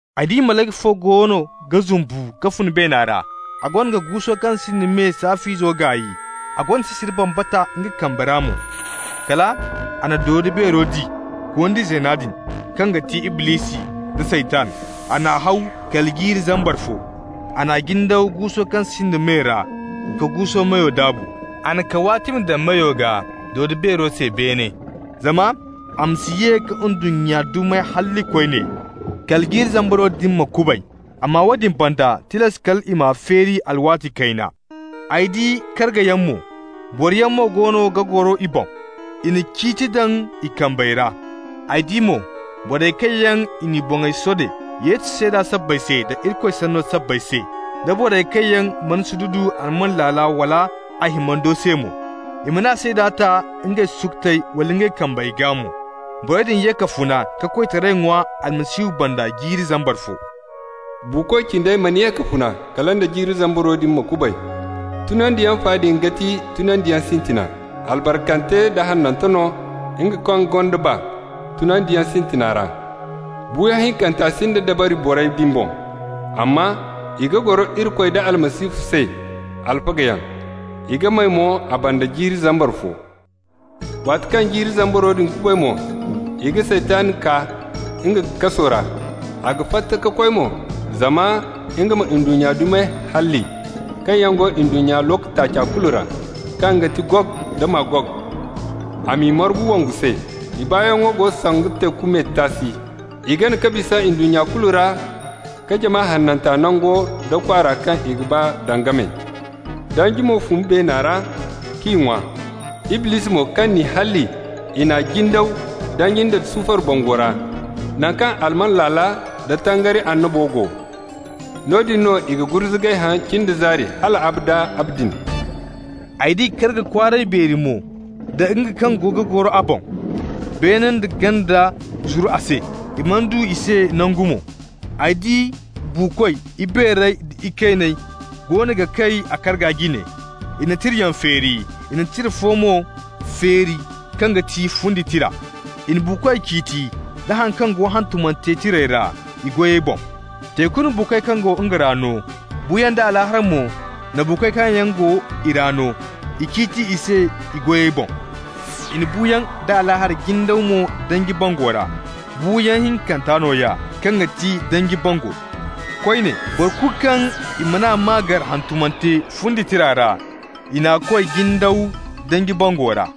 Ay di malayka fo goono ga zumbu ka fun beena ra. A goono ga guuso kaŋ sinda me saaf'izo gaay, a gonda sisiri bambata nga kambe ra mo. Kal a na dodo-beero di, gondi zeena din, kaŋ ga ti Iblisi nda Saytan. A n'a haw kala jiiri zambar fo. A n'a jindaw guuso kaŋ sinda me ra ka guuso meyo daabu. A na kawaatimi daŋ meyo gaa dodo-beero se beene, zama a ma si ye ka ndunnya dumey halli koyne kala jiiri zambaro din ma kubay. Amma woodin banda, tilas kal i m'a feeri alwaati kayna. Ay di kargayaŋ mo. Boroyaŋ mo goono ga goro i boŋ. I na ciiti daŋ i kambey ra. Ay di mo borey kaŋ yaŋ i n'i boŋey sode Yesu seeda sabbay se da Irikoy sanno sabbay se, da borey kaŋ yaŋ mana sududu alman laala wala a himando se mo. I mana a seeda ta ngey sukutey wala ngey kambey gaa mo. Borey din ye ka funa ka koytaray ŋwa Almasihu banda jiiri zambar fo. Buuko cindey mana ye ka funa kala nda jiiri zambaro din ma kubay. Tunandiyaŋ fa din ga ti tunandiyaŋ sintina. Albarkante da hanante no nga kaŋ gonda nga baa tunandiyaŋ sintina ra. Buuyaŋ hinkanta sinda dabari borey din boŋ, amma i ga goro Irikoy da Almasihu se alfagayaŋ. I ga may mo a banda jiiri zambar fo. Waati kaŋ jiiri zambaro din kubay mo, i ga Saytan kaa nga kaso ra. A ga fatta ka koy mo zama nga ma ndunnya dumey halli kaŋ yaŋ go ndunnya looko taaca kulu ra, kaŋ ga ti Gog da Magog, a m'i margu wongu se. I baayaŋo go sanda teeku me taasi. I gana ka bisa ndunnya kulu ra ka jama hananta nango nda kwaara kaŋ i ga ba daŋ game. Danji mo fun beena ra k'i ŋwa. Iblisi mo, kaŋ n'i halli, i n'a jindaw danji nda sufar bango ra, naŋ kaŋ alman laala da tangari annabo go. Noodin no i ga gurzugay haŋ cin da zaari hal abada abadin. Ay di karga kwaaray beeri mo da nga kaŋ go ga goro a boŋ. Beene nda ganda zuru a se, i mana du i se nangu mo. Ay di buukoy, ibeerey da ikayney, goono ga kay a karga jine. I na tirayaŋ feeri, i na tira fo mo feeri, kaŋ ga ti fundi tira. I na buukoy ciiti da haŋ kaŋ go hantumante tirey ra, i goyey boŋ. Teeku na buukoy kaŋ go nga ra no, buuyaŋ da Alaahara mo na buukoy kaŋ yaŋ go i ra no. I ciiti i se i goyey boŋ. I na buuyaŋ da Alaahara jindaw mo danji bango ra. Buuyaŋ hinkanta nooya, kaŋ ga ti danji bango. Koyne, boro kulu kaŋ i man'a maa gar hantumante fundi tira ra, i n'a koy jindaw danji bango ra.